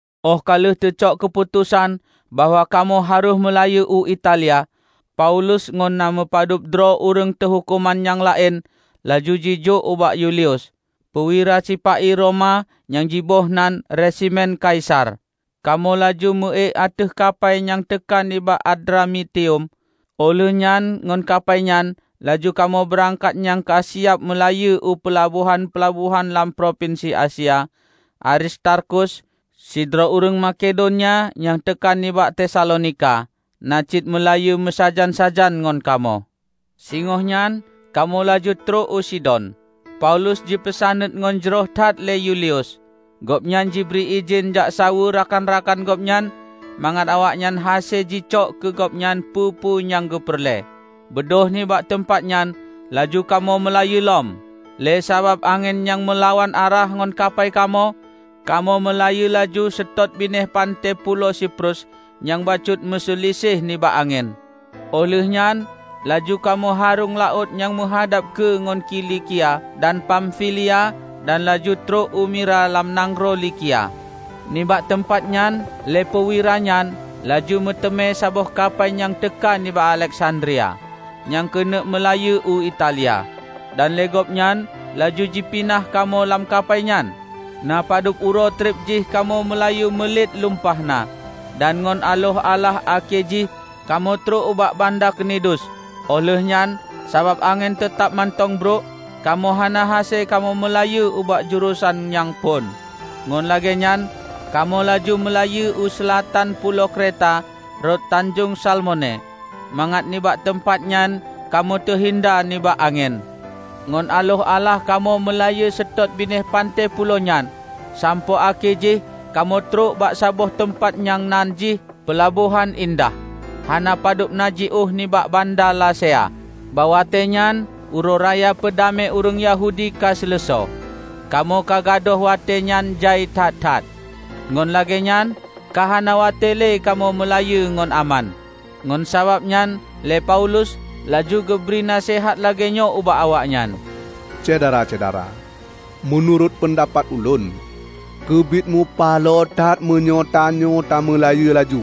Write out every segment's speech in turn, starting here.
Óh ka lheueh teucok keuputosan bahwa kamoe harôh meulayeue u Italia, Paulus ngon na meupadub droe ureuëng teuhuköman nyang laén laju jijok ubak Yulius, peuwira sipa-i Roma nyang jiboh nan "Resimen Kaisar". Kamoe laju meuék ateueh kapai nyang teuka nibak Adramitium, óh lheueh nyan ngon kapai nyan laju kamoe beurangkat nyang ka siab meulayeue u peulabohan-peulabohan lam propinsi Asia. Aristarkus, sidroe ureuëng Makedonia nyang teuka nibak Tesalonika, na cit meulayeue meusajan-sajan ngon kamoe. Singoh nyan kamoe laju trok u Sidon, Paulus jipeusaneut ngon jroh that lé Yulius. Gobnyan jibri idhin jak saweue rakan-rakan gobnyan mangat awaknyan hase jijok keu gobnyan peue-peue nyang geupeureulée. Beudôh nibak teumpat nyan laju kamoe meulayeue lom. Lé sabab angén nyang meulawan arah ngon kapai kamoe, kamoe meulayeue laju seutôt binéh panté pulo Siprus nyang bacut meuseuliseh nibak angén. Óh lheueh nyan laju kamoe haröng laôt nyang meuhadab keue ngon Kilikia dan Pamfilia dan laju trok u Mira lam nanggroe Likia. Nibak teumpat nyan lé peuwira nyan laju meuteumé saboh kapai nyang teuka nibak Aleksandria nyang keuneuk meulayeue u Italia. Dan lé gobnyan laju jipinah kamoe lam kapai nyan. Na padub uroe treb jih kamoe meulayeue mulet lumpah na, dan ngon aloh alah akhé jih kamoe trok ubak banda Knidus. Óh lheueh nyan, sabab angén teutab mantong brok, kamoe hana hase kamoe meulayeue ubak jurosan nyang phon. Ngon lagéenyan kamoe laju meulayeue u seulatan pulo Kreta rot Tanjong Salmone mangat nibak teumpat nyan kamoe teuhinda nibak angén. Ngon aloh alah kamoe meulayeue seutôt binéh panté pulo nyan sampoe akhé jih kamoe trok bak saboh teumpat nyang nan jih Peulabohan Indah, hana padub na jiôh nibak banda Lasea. Bak watée nyan Uroe Raya Peudamé ureuëng Yahudi ka seuleusoe. Kamoe ka gadôh watée nyang jai that-that, ngon lagée nyan ka hana watée le kamoe meulayeue ngon aman. Ngon sabab nyan lé Paulus laju geubri naseuhat lagée nyoe ubak awaknyan, "Syedara-syedara, meunurot peundapat ulôn, keubiet mupaloe that meunyoe tanyoe tameulayeue laju.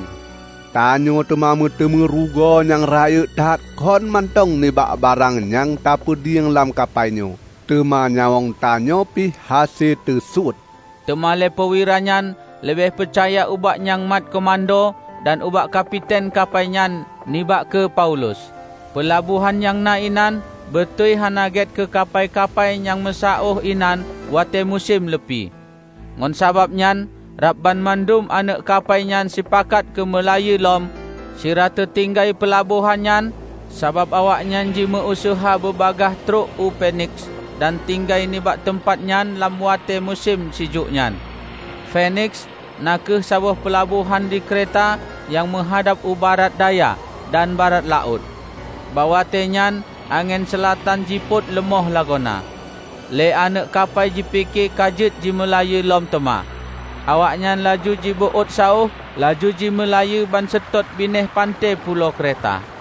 Tanyoe teuma meuteumé rugoe nyang raya that kon mantong nibak barang nyang tapeudieng lam kapai nyoe, teuma nyawöng tanyoe pih hase teusuet." Teuma lé peuwira nyan leubeh peucaya ubak nyang mat keumudo dan ubak kapiten kapai nyan nibak keu Paulus. Peulabohan nyang na inan beutôi hana gét keu kapai-kapai nyang meusaôh inan watée musém leupie. Ngon sabab nyan rab banmandum aneuëk kapai nyan sipakat keumeulayeue lom sira teutinggai peulabohan nyan sabab awaknyan jimeue useuha beubagaih trok u Feniks dan tinggai nibak teumpat nyan lam watée musém sijuek nyan. Feniks na kheueh saboh peulabohan di Kreta nyang meuhadab u barat daya dan barat laôt. Bak watéenyan angén seulatan jipôt leumoh lagoena. Lé aneuëk kapai jipike ka jeuet jimeulayeue lom teuma. Awaknyan laju jibeuôt saôh laju jimeulayeue banseutôt binéh panté pulo Kreta.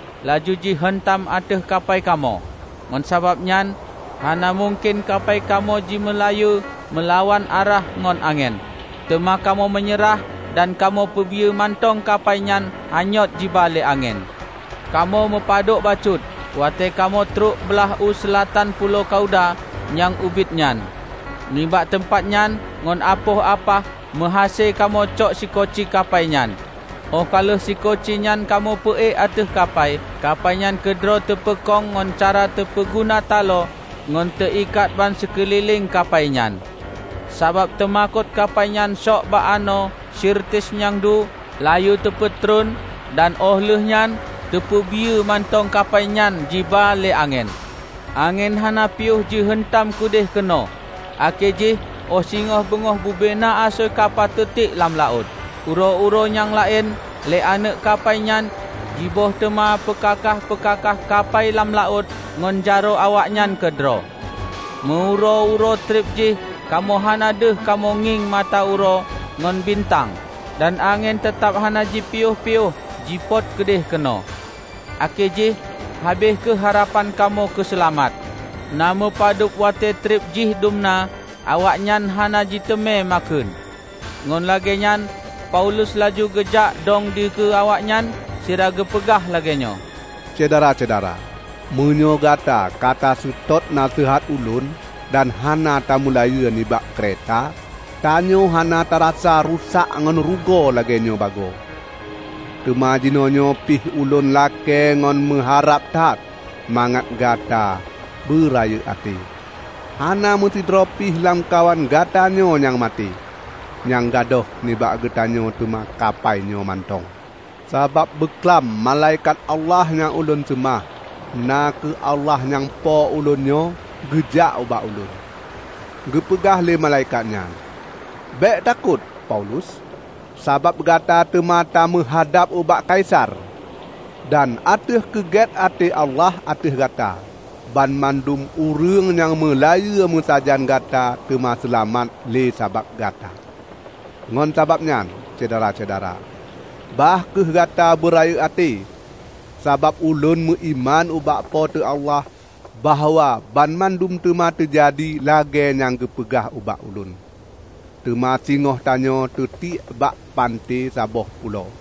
laju jiheuntam ateueh kapai kamoe. Ngon sababnyan hana mungken kapai kamoe jimeulayeue meulawan arah ngon angén, teuma kamoe meunyeurah dan kamoe peubiyeu mantong kapai nyan anyôt jiba lé angén. Kamoe meupadok bacut, watée kamoe trok blah u seulatan pulo Kauda nyang ubit nyan. Nibak teumpat nyan ngon apoh apah meuhase kamoe cok sikoci kapai nyan. Óh ka lheueh sikoci nyan kamoe peuék ateueh kapai, kapai nyan keudroe teupeukong ngon cara teupeuguna talo ngon teuikat bansikeulileng kapai nyan. Sabab teumakot kapai nyan sôk bak anoe Sirtis nyang deue, layeue teupeutreun dan óh lheueh nyan teupeubiyeu mantong kapai nyan jiba lé angén. Angén hana piôh jiheuntam keudeuh keunoe, akhé jih óh singoh beungoh bubena asoe kapai teutiek lam laôt. Uroe-uroe nyang laén lé aneuëk kapai nyan jiböih teuma peukakaih-peukakaih kapai lam laôt ngon jaroe awaknyan keudroe. Meu uroe-uroe treb jih kamoe hana deuh kamoe ngieng mata uroe ngon bintang, dan angén teutab hana jipiôh-piôh jipôt keudeuh keunoe. Akhé jih habéh kheueh harapan kamoe keuseulamat. Na meupadub watée treb jih dumna awaknyan hana jiteumé makheun. Ngon lagée nyan Paulus laju geujak dong dikeue awaknyan sira geupeugah lagée nyoe, "Syedara-syedara! Meunyoe gata ka taseutôt naseuhat ulôn dan hana tameulayeue nibak Kreta, tanyoe hana tarasa rusak ngon rugoe lagéenyoe bagoe. Teuma jinoenyoe pih ulôn lakée ngon meuharab that mangat gata beurayeuk até. Hana meusidroe pih lamkawan gata nyoe nyang maté; nyang gadôh nibak geutanyoe teuma kapai nyoe mantong. Sabab beuklam malaikat Allah nyang ulôn seumah, na kheueh Allah nyang po ulôn nyoe, geujak ubak ulôn. Geupeugah lé Malaikat nyan, 'Bék takot, Paulus! Sabab gata teuma tameuhadab ubak Kaisar. Dan ateueh keugét até Allah ateueh gata, banmandum ureuëng nyang meulayeue meusajan gata teuma seulamat lé sabab gata.' Ngon sabab nyan, Syedara-syedara, bah kheueh gata beurayeuk até! Sabab ulôn meuiman ubak Po teu Allah bahwa banmandum teuma teujadi lagée nyang geupeugah ubak ulôn. Teuma singoh tanyoe teutiek bak panté saboh pulo."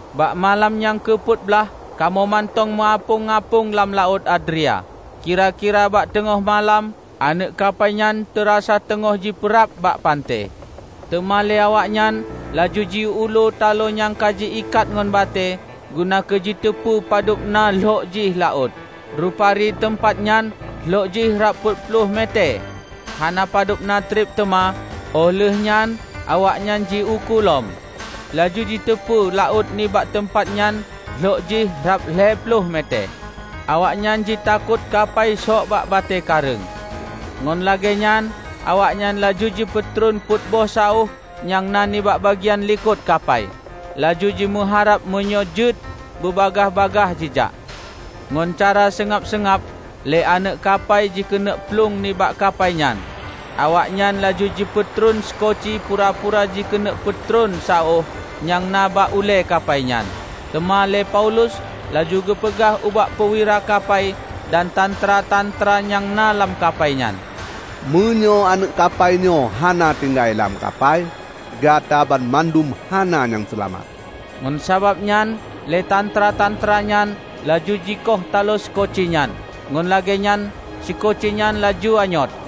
Bak malam nyang keu peuet blah kamoe mantong meuapöng-apöng lam Laôt Adria. Kira-kira bak teungoh malam aneuëk kapai nyan teurasa teungoh jipeurab bak panté. Teuma lé awaknyan laju jiulu talo nyang ka ji-ikat ngon batée guna keujiteupeu padub na lhok jih laôt. Rupari teumpat nyan lhok jih rab peuet ploh metée. Hana padub na treb teuma óh lheueh nyan awaknyan ji-ukô lom, laju jiteupeu laôt nibak teumpat nyan lhok jih rab lhée ploh metée. Awaknyan jitakot kapai shok bak batée kareueng, ngon lagée nyan awaknyan laju jipeutreun peuet boh saôh nyang na nibak bagian likot kapai, laju jimeuharab meunyoe jeuet beubagaih-bagaih jijak. Ngon cara seungab-seungab lé aneuëk kapai jikeuneuk plueng nibak kapai nyan. Awaknyan laju jipeutreun sikoci pura-pura jikeuneuk peutreun saôh nyang na bak ulée kapai nyan. Teuma lé Paulus laju geupeugah ubak peuwira kapai dan tantra-tantra nyang na lam kapai nyan, "Meunyoe aneuëk kapai nyoe hana tinggai lam kapai, Gata banmandum hana nyang seulamat." Ngon sabab nyan lé tantra-tantra nyan laju jikoh talo sikoci nyan, ngon lagée nyan sikoci nyan laju anyôt.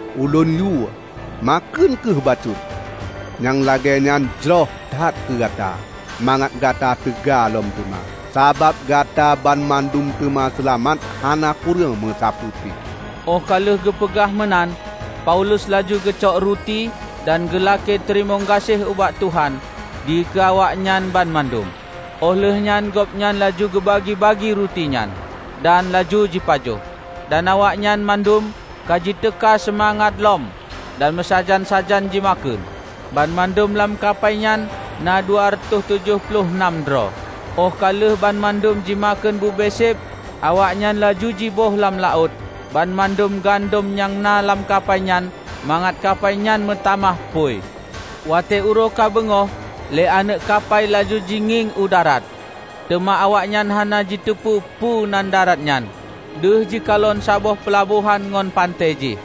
Ulôn yue, makheun kheueh bacut. Nyang lagée nyan jroh that keu gata, mangat gata teuga lom teuma. Sabab gatabanmandum teuma seulamat hana kureueng meusapeue pih." Óh ka lheueh geupeugah meunan Paulus laju geucok ruti dan geulakée teurimong gaséh ubak Tuhan dikeue awaknyan banmandum. Óh lheuehnyan gobnyan laju geubagi-bagi ruti nyan, dan laju jipajoh. Dan awaknyan mandum ka jiteuka seumangat lom dan meusajan-sajan jimakheun. Banmandum lam kapai nyan na dua reutoh tujoh ploh nam droe. Óh ka lheueh banmandum jimakheun bube séb, awaknyan laju jiböih lam laôt banmandum gandom nyang na lam kapai nyan mangat kapai nyan meutamah phui. Watée uroe ka beungoh, lé aneuëk kapai laju jingieng u darat, teuma awaknyan hana jiteupeu peue nan darat nyan. Deuh jikalon saboh peulabohan ngon panté jih.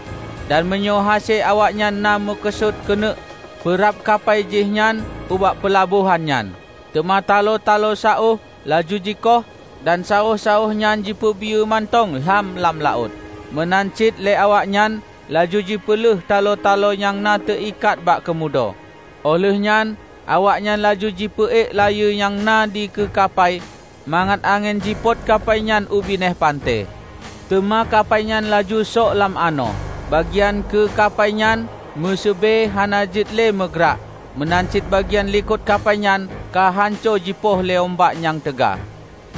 Dan meunyoe hase awaknyan na meukeusut keuneuk peurab kapai jih nyan ubak peulabohan nyan. Teuma talo-talo saôh laju jikoh dan saôh-saôh nyan jipeubiyeu mantong lham lam laôt. Meunan cit lé awaknyan laju jipeulheueh talo-talo nyang na teuikat bak keumudo. Óh lheueh nyan awaknyan laju jipeuék layeue nyang na dikeue kapai mangat angén jipot kapainyan u binéh panté. Teuma kapai nyan laju sok lam anoe. Bagian keue kapai nyan meuseubée hana jeuet lé meugrak, meunan cit bagian likot kapai nyan ka hanco jipoh lé umbak nyang teuga.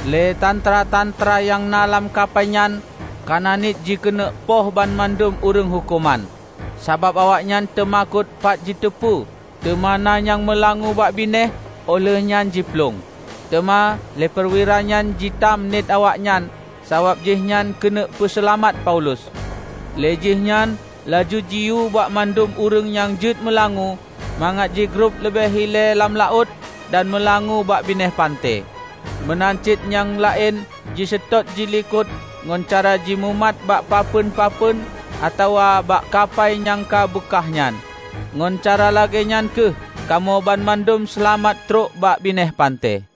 Lé tantra-tantra nyang na lam kapai nyan kana niet jikeuneuk poh banmandum ureuëng huköman, sabab awaknyan teumakot pat jiteupeu teuma na nyang meulangue bak binéh óh lheueh nyan jiplueng. Teuma lé peuwira nyan jitam niet awaknyan sabab jihnyan keuneuk peuseulamat Paulus. Lé jihnyan laju jiyue bak mandum ureuëng nyang jeuet meulangoe mangat jigrob leubeh ilée lam laôt dan meulangoe bak binéh panté; meunan cit nyang laén jiseutôt jilikot ngon cara jimumat bak papeuen-papeuen atawa bak kapai nyang ka beukah nyan. Ngon cara lagée nyan kheueh kamoe banmandum seulamat trok bak binéh panté.